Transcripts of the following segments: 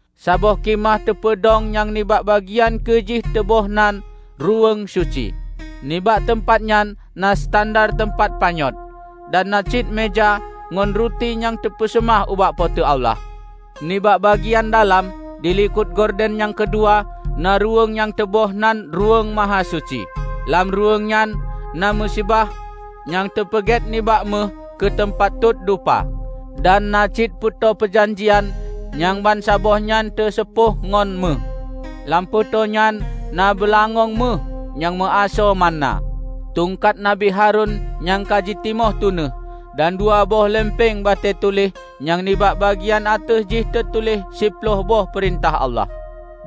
Saboh khimah teupeudong nyang nibak bagian keu jih teuboh nan Ruweueng Suci. Nibak teumpat nyan na standar teumpat panyöt, dan na cit meuja ngon ruti nyang teupeuseumah ubak Po teu Allah. Nibak bagian dalam, dilikot gorden nyang keudua, na ruweueng nyang teuboh nan Ruweueng Mahasuci. Lam ruweueng nyan na miseubah nyang teupeugét nibak méuh keu teumpat tot dupa, dan na cit Peutoe Peujanjian nyang bansaboh nyan teuseupoh ngon méuh. Lam Peutoe nyan na beulangöng méuh nyang meuasoe manna, tungkat Nabi Harun nyang ka jitimoh tunéh, dan dua boh leumpeung batée tuléh nyang nibak bagian ateueh jih teutuléh siploh boh peurintah Allah.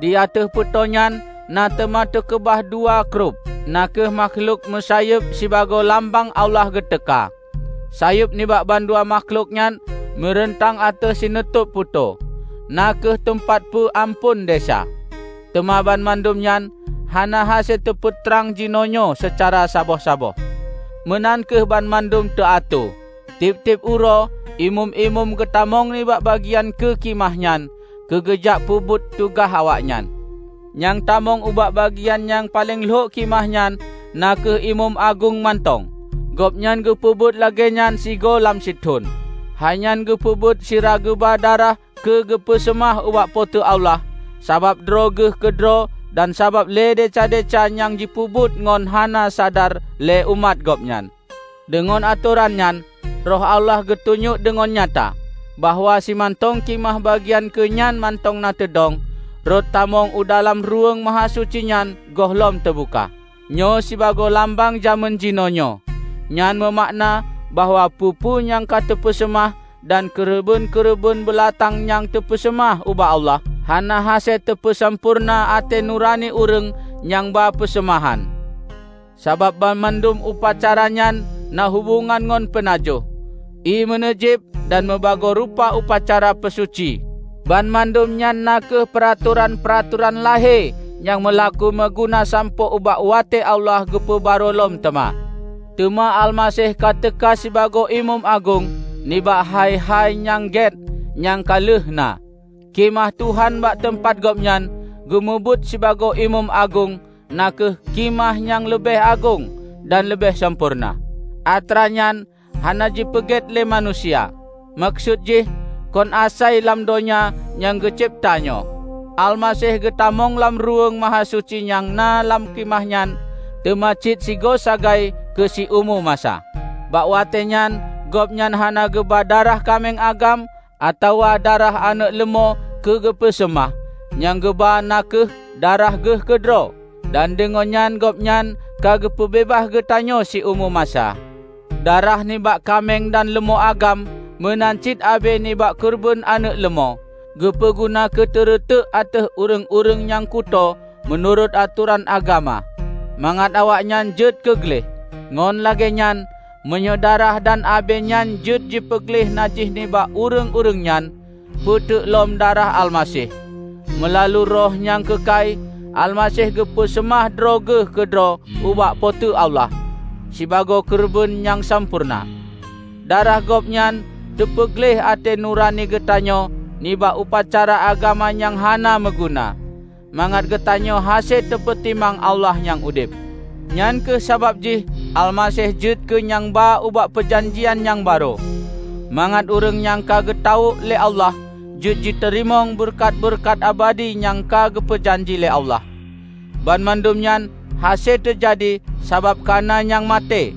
Di ateueh Peutoe nyan na teuma teukeubah dua Kerub, na kheueh makhlok meusayeub sibagoe lambang Allah geuteuka. Sayeueb nibak bandua makhlok nyan meureuntang ateueh sinutôb Peutoe, na kheueh teumpat peu amphon desya. Teuma banmandum nyan hana hase teupeutrang jinoenyoe seucara saboh-saboh. Meunan kheueh banmandum teuatoe. Tieb-tieb uroe imeum-imeum geutamong nibak bagian keu khimah nyan keugeujak peubuet tugaih awaknyan. Nyang tamong ubak bagian nyang paleng lhok khimah nyan na kheueh imeum agong mantong. Gobnyan geupeubuet lagée nyan sigoe lam sithon. Hai nyan geupeubuet sira geuba darah keugeupeuseumah ubak Po teu Allah sabab droe geuh keudroe dan sabab lé desya-desya nyang jipeubuet ngon hana sadar lé umat Gobnyan. Deungon atoran nyan, Roh Allah geutunyok deungon nyata, bahwa simantong khimah bagian keu nyan mantong na teudong, rot tamong u dalam Ruweueng Mahasuci nyan gohlom teubuka. Nyoe sibagoe lambang jamén jinoenyoe; nyan meumakna bahwa peue-peue nyang ka teupeuseumah dan keureubeuen-keureubeuen beulatang nyang teupeuseumah ubak Allah, hana hase teupeusampoereuna até nurani ureuëng nyang ba peuseumahan. Sabab banmandum upacara nyan na hubongan ngon peunajoh, ié meuneujiéb, dan meubagoe rupa upacara peusuci. Banmandum nyan na kheueh peuratoran-peuratoran lahé nyang meulaku meuguna sampoe ubak watée Allah geupeu barô lom teuma. Teuma Almaseh ka teuka sibagoe Imeum Agong nibak hai-hai nyang gét nyang ka lheueh na. Khimah Tuhan bak teumpat Gobnyan geumubuet sibagoe Imeum Agong na kheueh Khimah nyang leubeh agong dan leubeh sampoereuna. Atra nyan hana jipeugét lé manusia; meukeusut jih, kon asai lam donya nyang geucebta nyoe. Almaseh geutamong lam Ruweueng Mahasuci nyang na lam Khimah nyan teuma cit sigoe sagai keu siumu masa. Bak watée nyan Gobnyan hana geuba darah kaméng agam atawa darah aneuëk leumô keugeupeuseumah; nyang geuba na kheueh darah Geuh keudroe, dan deungon nyan Gobnyan ka geupeubeubaih geutanyoe siumu masa. Darah nibak kaméng dan leumô agam meunan cit abée nibak keureubeuen aneuëk leumô, geupeu guna keuteureutek ateueh ureuëng-ureuëng nyang kutoe meunurot atoran agama mangat awaknyan jeuet keu gleh. Ngon lagée nyan, meunyoe darah dan abée nyan jeuet jipeugleh najih nibak ureuëng-ureuëng nyan, peuteuk lom darah Almaseh! Meulalu Roh nyang keukai, Almaseh geupeu seumah droe Geuh keudroe ubak Po teu Allah sibagoe keureubeuen nyang sampoereuna. Darah Gobnyan teupeugleh até nurani geutanyoe nibak upacara agama nyang hana meuguna, mangat geutanyoe hase tapeutimang Allah nyang udeb. Nyang kheueh sabab jih Almaseh jeuet keu nyang ba ubak peujanjian nyang barô, mangat ureuëng nyang ka geutawök lé Allah jeuet jiteurimong beureukat-beureukat abadi nyang ka geupeujanji lé Allah. Banmandum nyan hase teujadi sabab kana nyang maté,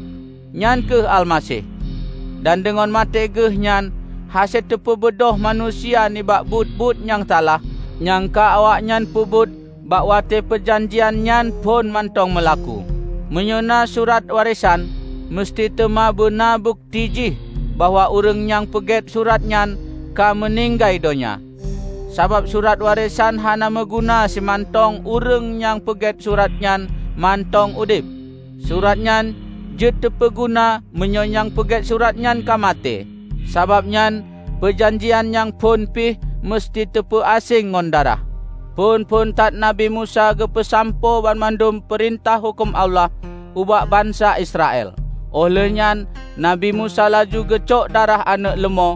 nyan kheueh Almaseh; dan deungon maté Geuh nyan hase teupeubeubaih manusia nibak buet-buet nyang salah nyang ka awaknyan peubuet bak watée peujanjian nyang phon mantong meulaku. Meunyoe na surat warésan, meuseuti teuma beuna bukeuti jih bahwa ureuëng nyang peugét surat nyan ka meuninggai donya. Sabab surat warésan hana meuguna simantong ureuëng nyang peugét surat nyan mantong udeb. Surat nyan jeuet teupeuguna meunyoe nyang peugét surat nyan ka maté. Sabab nyan peujanjian nyang phon pih meuseuti teupeu aséng ngon darah. Phon-phon that Nabi Musa geupeusampoe banmandum peurintah huköm Allah ubak bansa Israel. Óh lheueh nyan Nabi Musa laju geucok darah aneuëk leumô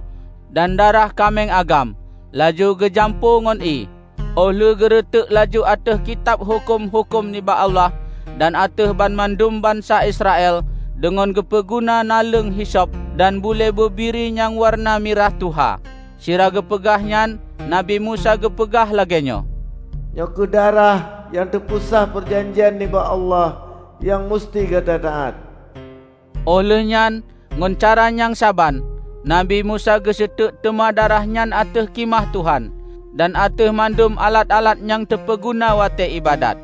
dan darah kaméng agam, laju geujampu ngon ié, óh lheueh geureutek laju ateueh Kitab Huköm-huköm nibak Allah dan ateueh banmandum bansa Israel deungon geupeu guna naleueng hisop dan bulée bubiri nyang wareuna mirah tuha. Sira geupeugah nyan Nabi Musa geupeugah lagée nyoe, "Nyoe kheueh darah nyang teupeusah peujanjian nibak Allah nyang meuseuti gata taát." Óh lheueh nyan ngon cara nyang saban, Nabi Musa geuseutek teuma darah nyan ateueh Khimah Tuhan dan ateueh mandum alat-alat nyang teupeuguna watée iébadat.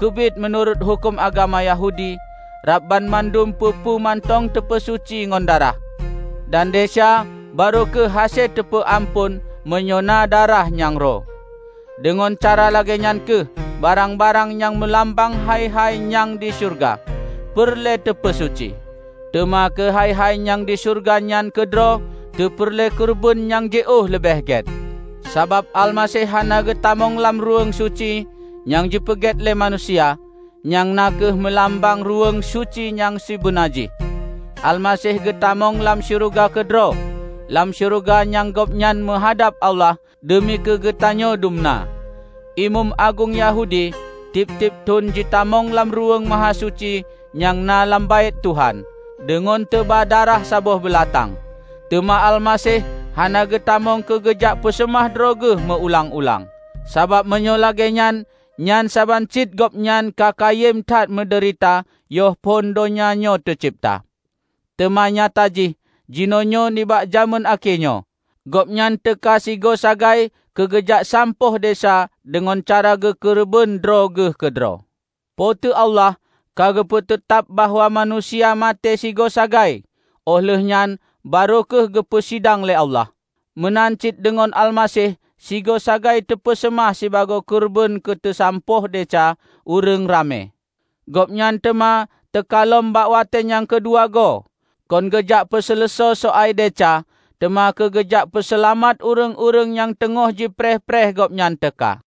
Keubiet meunurot huköm agama Yahudi, rab banmandum peue-peue mantong teupeusuci ngon darah; dan desya barô kheueh hase teupeu amphon meunyoe na darah nyang ro. Deungon cara lagée nyan kheueh barang-barang nyang meulambang hai-hai nyang di syeuruga, peureulée teupeusuci. Teuma keu hai-hai nyang di syeuruga nyan keudroe teupeureulée keureubeuen nyang jiôh leubeh gét. Sabab Almaseh hana geutamong lam Ruweueng Suci nyang jipeugét lé manusia, nyang na kheueh meulambang Ruweueng Suci nyang sibeuna jih. Almaseh geutamong lam syeuruga keudroe; lam syeuruga nyan Gobnyan meuhadab Allah deumi keugeutanyoe dumna. Imeum agong Yahudi tieb-tieb thon jitamong lam Ruweueng Mahasuci nyang na lam Baét Tuhan deungon teuba darah saboh beulatang. Teuma Almaseh hana geutamong keugeujak peuseumah droe Geuh meu ulang-ulang. Sabab meunyoe lagée nyan, nyan saban cit Gobnyan ka kayém that meudeurita yoh phon donya nyoe teucebta. Teuma nyata jih, jinoenyoe nibak jamén akhé nyoe, Gobnyan teuka sigoe sagai keugeujak sampôh desya deungon cara geukeureubeuen droe Geuh keudroe. Po teu Allah ka geupeu teutab bahwa manusia maté sigoe sagai óh lheueh nyan barô kheueh geupeu sidang lé Allah. Meunan cit deungon Almaseh sigoe sagai teupeuseumah sibagoe keureubeuen keuteusampôh desya ureuëng ramé. Gobnyan teuma teuka lom bak watée nyang keudua goe, kon geujak peuseuleusoe soai desya, teuma keugeujak peuseulamat ureuëng-ureuëng nyang teungoh jipreh-preh Gobnyan teuka.